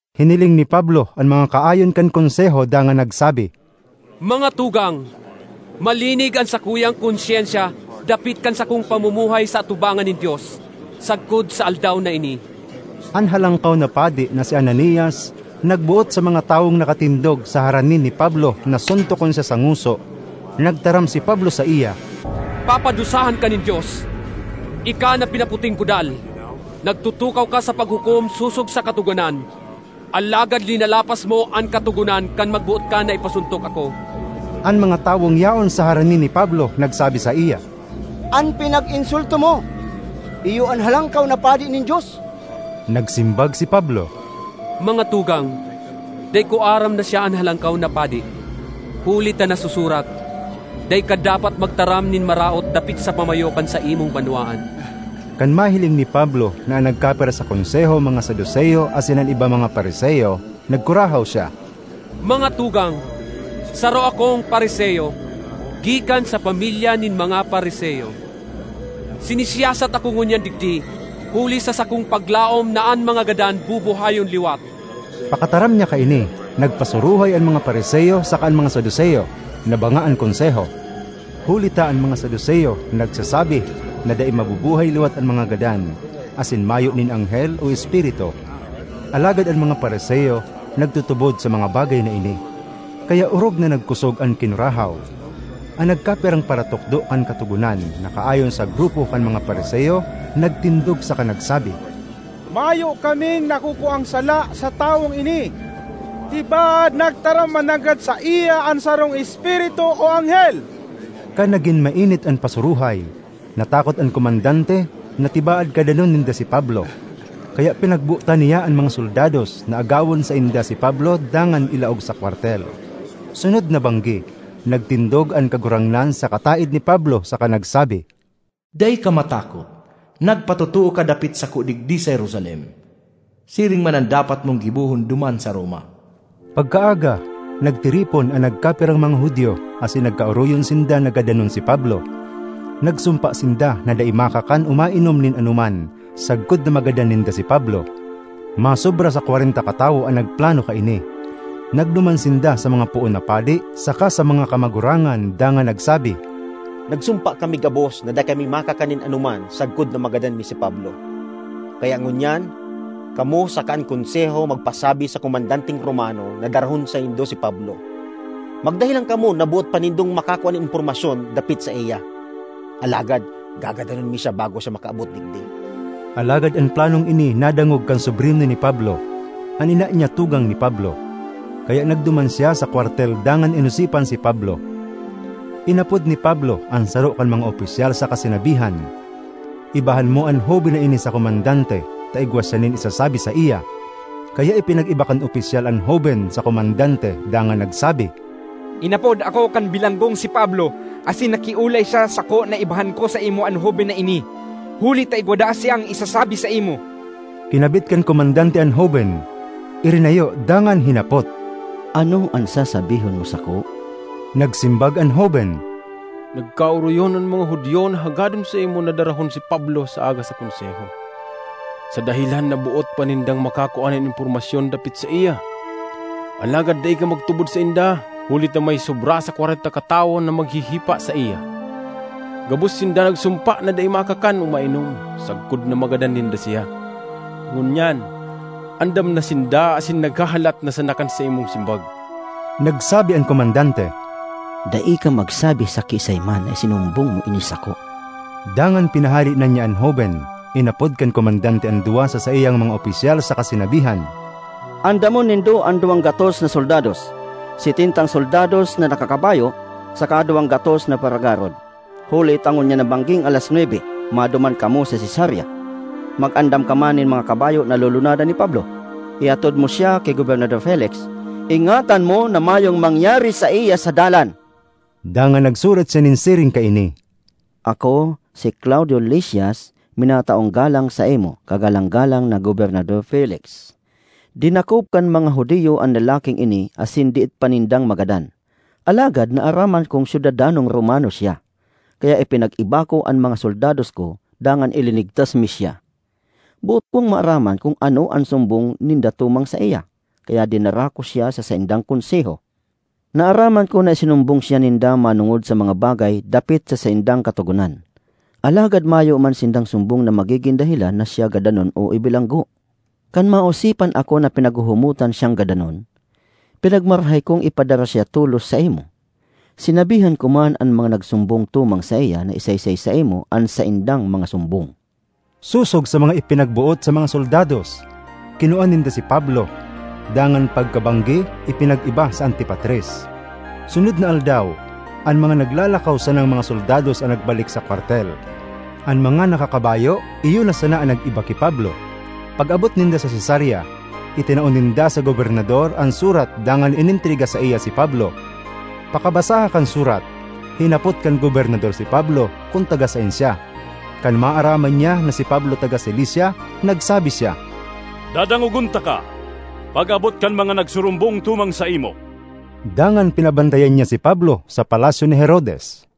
Hiniling ni Pablo an mga kaayon kan Konseho dangan nagsabi, “Mga tugang! Malinig an sakuyang konsyensya dapit kan sakong pamumuhay sa atubangan nin Dios, sagkod sa aldaw na ini.” An Halangkaw na Padi na si Ananias nagboot sa mga tawong nakatindog sa harani ni Pablo na suntokon siya sa ngoso. Nagtaram si Pablo saiya, “Papadusahan ka nin Dios—ika na pinaputing kudal! Nagtutukaw ka sa paghukom sosog sa Katogonan, alagad linalapas mo an Katogonan kan magboot ka na ipasuntok ako.” An mga tawong yaon sa harani ni Pablo nagsabi saiya, “An pinag-insulto mo iyo an Halangkaw na Padi nin Dios.” Nagsimbag si Pablo, “Mga tugang, dai ko aram na siya an Halangkaw na Padi. Huli ta nasusurat, ‘Dai ka dapat magtaram nin maraot dapit sa pamayo kan saimong banwaan.’” Kan mahiling ni Pablo na an nagkapira sa konseho mga Saduceo asin an iba mga Fariseo, nagkurahaw siya, “Mga tugang! Saro akong Fariseo, gikan sa pamilya nin mga Fariseo. Sinisiyasat ako ngunyan digdi huli sa sakong paglaom na an mga gadan bubuhayon liwat!” Pakataram niya kaini, nagpasuruhay an mga Fariseo saka an mga Saduceo; nabanga an Konseho. (Huli ta an mga Saduceo nagsasabi na dai mabubuhay liwat an mga gadan asin mayo nin anghel o espiritu. Alagad an mga Fariseo nagtutubod sa mga bagay na ini.) Kaya orog na nagkosog an kinurahaw; an nagkapirang paratukdo kan Katogonan na kaayon sa grupo kan mga Fariseo nagtindog saka nagsabi, “Mayo kaming nakukuang sala sa tawong ini! Tibaad nagtaram mananggad saiya an sarong espiritu o anghel!” Kan nagin mainit an pasuruhay, natakot an komandante na tibaad gadanon ninda si Pablo. Kaya pinagbotan niya an mga soldados na agawon sainda si Pablo dangan ilaog sa kwartel. Sunod na banggi, nagtindog an Kagurangnan sa kataed ni Pablo saka nagsabi, “Dai ka matakot! Nagpatotoo ka dapit sako digdi sa Jerusalem; siring man an dapat mong gibohon duman sa Roma.” Pagkaaga, nagtiripon an nagkapirang mga Judio asin nagkaoroyon sinda na gadanon si Pablo. Nagsumpa sinda na dai makakan o mainom nin anoman sagkod na magadan ninda si Pablo. Masobra sa kwarenta katawo an nagplano kaini. Nagduman sinda sa mga poon na padi saka sa mga kamagurangan dangan nagsabi, “Nagsumpa kami gabos na dai kami makakan nin anoman sagkod na magadan mi si Pablo. Kaya ngunyan, kamo saka an Konseho magpasabi sa komandanteng Romano na darahon saindo si Pablo. Magdahelan kamo na boot pa nindong makakua nin impormasyon dapit saiya. Alagad gagadanon mi siya bago siya makaabot digdi.” Alagad an planong ini nadangog kan sobrino ni Pablo (an ina niya tugang ni Pablo), kaya nagduman siya sa kwartel dangan inosipan si Pablo. Inapod ni Pablo an saro kan mga opisyal saka sinabihan, “Ibahan mo an hoben na ini sa komandante ta igwa siya nin isasabi saiya.” Kaya ipinag-iba kan opisyal an hoben sa komandante dangan nagsabi, “Inapod ako kan bilanggong si Pablo asin nakiolay siya sako na ibahan ko saimo an hoben na ini, huli ta igwa daa siyang isasabi saimo.” Kinabit kan komandante an hoben, irinayo dangan hinapot, “Ano an sasabihon mo sako?” Nagsimbag an hoben, “Nagkaoroyon an mga Judio na hagadon saimo na darahon si Pablo sa aga sa Konseho, sa dahelan na boot pa nindang makakua nin impormasyon dapit saiya. Alagad dai ka magtubod sainda huli ta may sobra sa kwarenta katawo na maghihipa saiya. Gabos sinda nagsumpa na dai makakan o mainom sagkod na magadan ninda siya. Ngunyan andam na sinda asin naghahalat na sana kan saimong simbag.” Nagsabi an komandante, “Dai ka magsabi sa kiisay man na isinumbong mo ini sako.” Dangan pinahale na niya an hoben. Inapod kan komandante an duwa sa saiyang mga opisyal saka sinabihan, “Andamon nindo an duwang gatos na soldados, setentang soldados na nakakabayo saka duwang gatos na paragarod, huli ta ngunyan na bangging alas nwebe, maduman kamo sa Cesarea. Mag-andam ka man nin mga kabayo na lulunadan ni Pablo; ihatod mo siya ki Gobernador Felix. Ingatan mo na mayong mangyari saiya sa dalan.” Dangan nagsurat siya nin siring kaini: ”Ako, si Claudio Lisias, minataong galang saimo, Kagalanggalang na Gobernador Felix. Dinakop kan mga Judio an lalaking ini asin diit pa nindang magadan. Alagad naaraman kong syudadanong Romano siya, kaya ipinag-iba ko an mga soldados ko dangan ilinigtas mi siya. Boot kong maaraman kun ano an sumbong ninda tumang saiya, kaya dinara ko siya sa saindang Konseho. Naaraman ko na isinumbong siya ninda manongod sa mga bagay dapit sa saindang katogonan, alagad mayo man sindang sumbong na magigin dahelan na siya gadanon o ibilanggo. Kan maosipan ako na pinaghuhumotan siyang gadanon, pinagmarahay kong ipadara siya tolos saimo. Sinabihan ko man an mga nagsumbong tumang saiya na isaysay saimo an saindang mga sumbong.” Sosog sa mga ipinagboot sa mga soldados, kinua ninda si Pablo, dangan pagkabanggi ipinag-iba sa Antipatris. Sunod na aldaw, an mga naglalakaw sanang mga soldados an nagbalik sa kwartel; an mga nakakabayo iyo na sana an nag-iba ki Pablo. Pag-abot ninda sa Cesarea, itinao ninda sa gobernador an surat dangan inentrega saiya si Pablo. Pakabasaha kan surat, hinapot kan gobernador si Pablo kun taga saen siya. Kan maaraman niya na si Pablo taga Cilicia, nagsabi siya, “Dadangogon taka pag-abot kan mga nagsurumbong tumang saimo.” Dangan pinabantayan niya si Pablo sa palasyo ni Herodes.